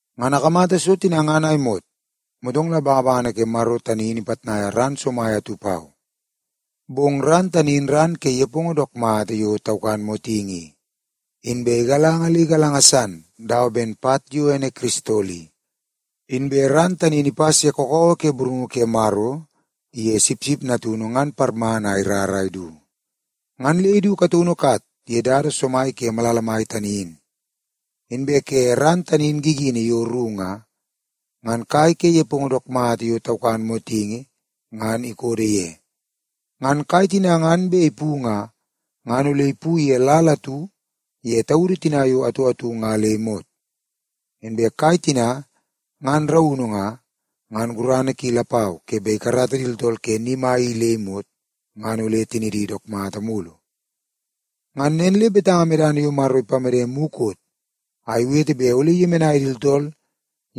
Ngan akamata so tina ngan a imot, motong la bangabangana ke Maro tani in ipitnaia ran somai atu pau. Bong ran tani in ran ke nepongo dook mata yo taukan motingi i, inbe igalanga le igalanga san dawa ben pat yo ene kiristol i. Inbe ran tani in ipas ye kakawa ke burungu ke Maro iye Sipsip Natunu ngan parmana a irar a idu. Ngan le idu kataunu kat ye dada somai ke malala mai tani in. Inbe ke ran tani in gigini yo ru nga, ngan kai ke nepongo dook mata yo taukan motingi ngan ikodo ye. Ngan kai tina ngan bet ipu nga, ngan ole ipu ye lal atu ye taudu tina yo atu atu nga le imot. Inbe kai tina ngan raunu nga, ngan gurana ki lapau ke bet ikarata di tooltool ke ni mai i le imot, ngan ole tinidi dook mata mulu. Ngan nen le betanga medana yo Maro ipamede mukot a iwete bet ole iyemenai di tooltool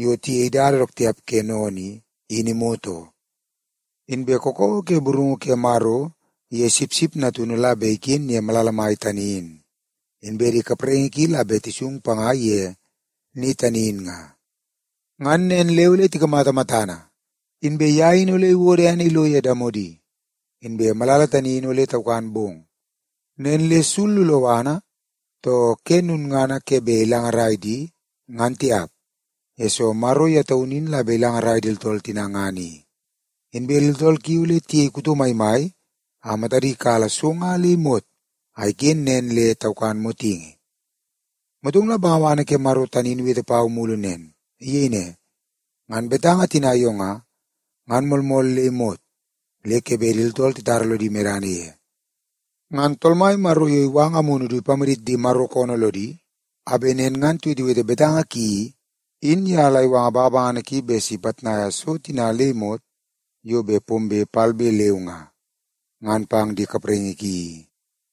yo tiyei dada dook tiap ke sennene i, in imot oo. Inbe kakawa ke burungu ke Maro iye Sipsip Natunu la bet iken ye malala mai tani in, inbe di kapraingi ki la bet tisung panga ye ni tani in nga. Ngan nen le ole tikamata matana, inbe ye in ole iwodo ene ilo ye damodi. Inbe malala tani in ole taukan bong, nen le sul loloana too ke lulngana ke bet ilangarai di ngan tiap, yesoo Maro ye taunu in la bet ilangarai di tooltool tina ngan i. Inbe di tooltool ki ole tiyei kuto maimai a matadi kala so nga le imot a iken nen le taukan motingi. Motong la bangabangana ke Maro tani in iwete pau mulu nen. Iyei ne, “Ngan betanga tina yo nga, ngan moolmool le imot le ke bet di tooltool titara lodi medana ye. Ngan Tool Mai Maro yo iwanga Amunu du ipamadit di Maro koonoo lodi a bet nen ngan tiwetewete betanga ki i, in ye la iwanga bangabangana ki bet si ipitnai so tina le imot yo bet pombe palbe leu nga, ngan pang di kapraingi ki i.”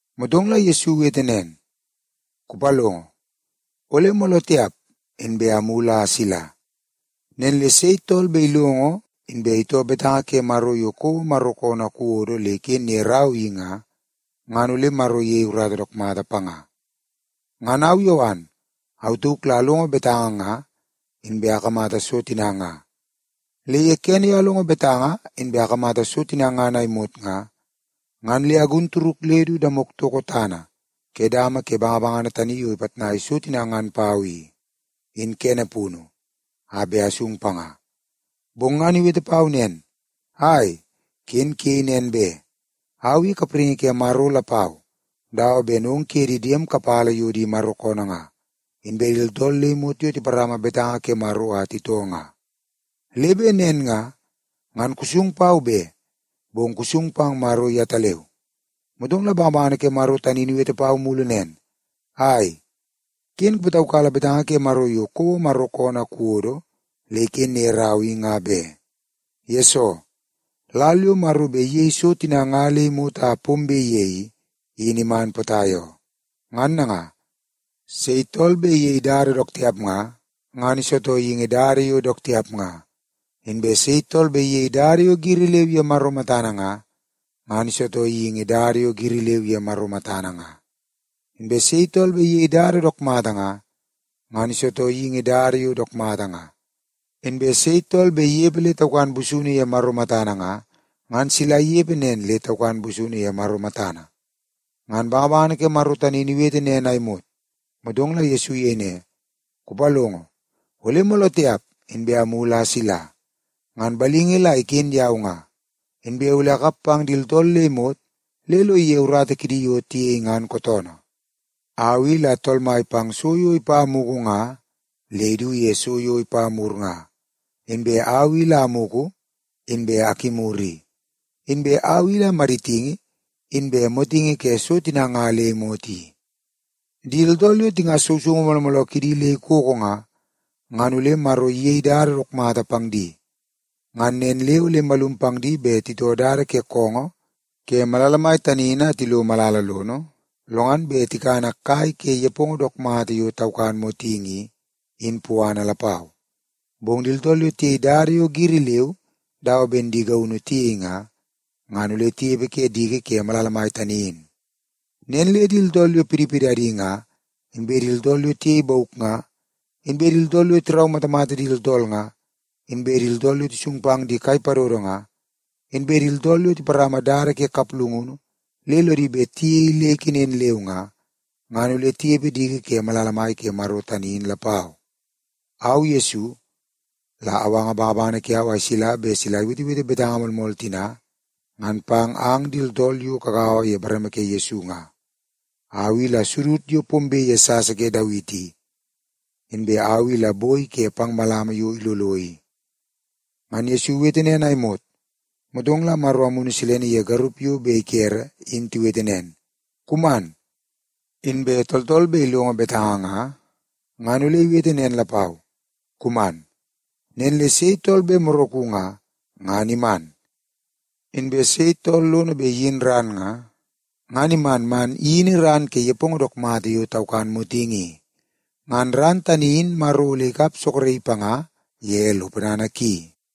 Motong la Yesu iwete nen, “Kupalongo, ole mooloo tiap inbe amulu a asila! Nen le sei tool bet ilongo inbe itoo betanga ke Maro yo kouo koonoo a kuwodo le iken ye rau i nga, ngan ole Maro iyei urata dook mata panga.” Ngan au Yowan, au tauk la alongo betanga nga, inbe akamata so tina nga. Le ye kene yo alongo betanga inbe akamata so tina ngan a imot nga, ngan le agun turuk le du damok toko tana ke dama ke bangabangana tani yo ipitnai so tina ngan pau i, in kene punu a bet asung panga. Bong ngan iwete pau nen, “Ai, ken kuyei nen be! Au i kapraingi ke Maro lapau dawa ben ong kuye di diem kapala yo di Maro koonoo nga, inbe di tooltool le imot yo tiparama betanga ke Maro a titoo nga. Le bet nen nga, ngan kusung pau be, bong kusung pang Maro yetaleu.” Motong la bangabangana ke Maro tani in iwete pau mulu nen, “Ai, ken kupataukala betanga ke Maro yo kouo koonoo a kuwodo le iken ye rau i nga be, yesoo lal yo Maro bet iyei so tina nga le imot a pombe ye i, in iman potai oo. Ngan nanga, sei tool bet iyei dada dook tiap nga, ngan isitoo geingi dada yo dook tiap nga. Inbe sei tool bet iyei dada yo giri leu ye Maro matana nga, ngan isitoo geingi dada yo giri leu ye Maro matana nga. Inbe sei tool bet iyei dada dook mata nga, ngan isitoo geingi dada yo dook mata nga. Inbe sei tool bet inepe le taukan busunu ye Maro matana nga, ngan sila inepe nen le taukan busunu ye Maro matana.” Ngan bangabangana ke Maro tani in iwete nen a imot, motong la Yesu iyei ne, “Kupalongo, ole mooloo tiap inbe amulu a asila! Ngan balingi la iken yau nga, inbe ole akap pang di tooltool le imot le lo ige urata kidi yo tiyei ngan kootoonoo. Au i la Tool Mai pang so yo ipa mugu nga le idu ye so yo ipa mur nga. Inbe au i la amugu, inbe akimur i. Inbe au i la maditingi, inbe motingi ke so tina nga le imot i. “Di tooltool yo tingas sousoungu mooloo mooloo kidi le ikoko nga, ngan ole Maro iyei dada dook mata pang di. Ngan nen le ole imalum pang di bet titoo dada ke koongoo ke malala mai tani in a tilo malala lono lo ngan bet tikana kai ke nepongo dook mata yo taukan motingi i, in puana lapau. Bong di tooltool yo tiyei dada yo giri leu dawa ben di gaunu tiyei nga, ngan ole tinepe ke diki ke malala mai tani in. Nen le di tooltool yo pidipidadi nga, inbe di tooltool yo tiyei bauk nga, inbe di tooltool yo tiraumatamata di tooltool nga, inbe di tooltool yo tisung pang di kai padodo nga, inbe di tooltool yo tiparama dada ke kaplungunu le lodi bet tiyei le ikenen leu nga, ngan ole tinepe diki ke malala mai ke Maro tani in lapau. “Au Yesu, la awanga bangabangana kiau a isila bet sila iwetewete betanga moolmool tina ngan pang ang di tooltool yo kagaua ye bareme ke Yesu nga. Au i la sudud yo pombe ye sasa ke Dawiti i, inbe au i la boi ke pang malama yo ilolo i.” Ngan Yesu iwete nen a imot, motong la Maro Amunu Silene iye garup yo bet ikere in tiwete nen, “Kuman!” Inbe tooltool bet ilongo betanga nga, ngan ole iwete nen lapau, “Kuman!” Nen le sei tool bet moraku nga, ngan iman. Inbe sei tool lono bet le iyin ran nga, ngan iman man iyini ran ke nepongo dook mata yo taukan motingi i. Ngan ran tani in Maro ole ikap soroki panga ye lo ponana ki.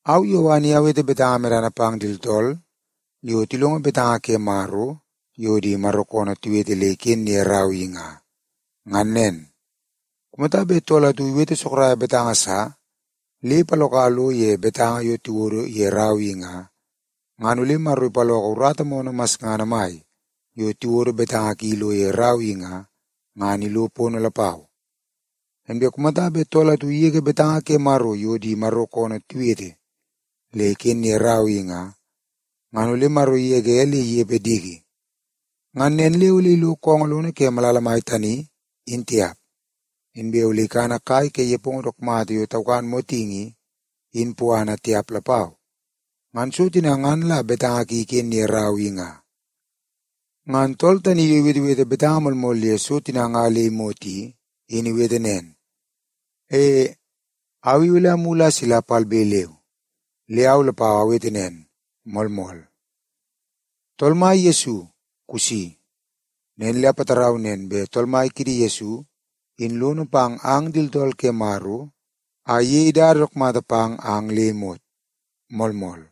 Au Yowan i awete betanga medana pang di tooltool yo tilongo betanga ke Maro yo di Maro koonoo tiwete le iken ye rau i nga, ngan nen. Kumata bet tool atu iwete sorok betanga sa le ipaloka lo ye betanga yo tiwodo ye rau i nga, ngan ole Maro ipaloko urata moonoo masngana mai yo tiwodo betanga ki ilo ye rau i nga, ngan ilo pono lapau. Inbe kumata bet tool atu igege betanga ke Maro yo di Maro koonoo tiwete le iken ye rau i nga, ngan ole Maro igege le inepe diki. Ngan nen le ole ilo koongoo lono ke malala mai tani, in tiap. Inbe ole ikana kai ke nepongo dook mata yo taukan motingi i, in puana tiap lapau. Ngan so tina ngan la betanga ki iken ye rau tani i nga. Ngan tool tani yo iwetewete betanga moolmool ye so tina nga le imot i, in iwete nen, “E, au i ole amulu a asila palbe leu.” Le au lapau awete nen, “Moolmool. Tool Mai Yesu, kusi.” Nen le apatarau nen bet Tool Mai kiidi Yesu in lono pang ang di tooltool ke Maro a iyei dada dook mata pang ang le imot. Moolmool.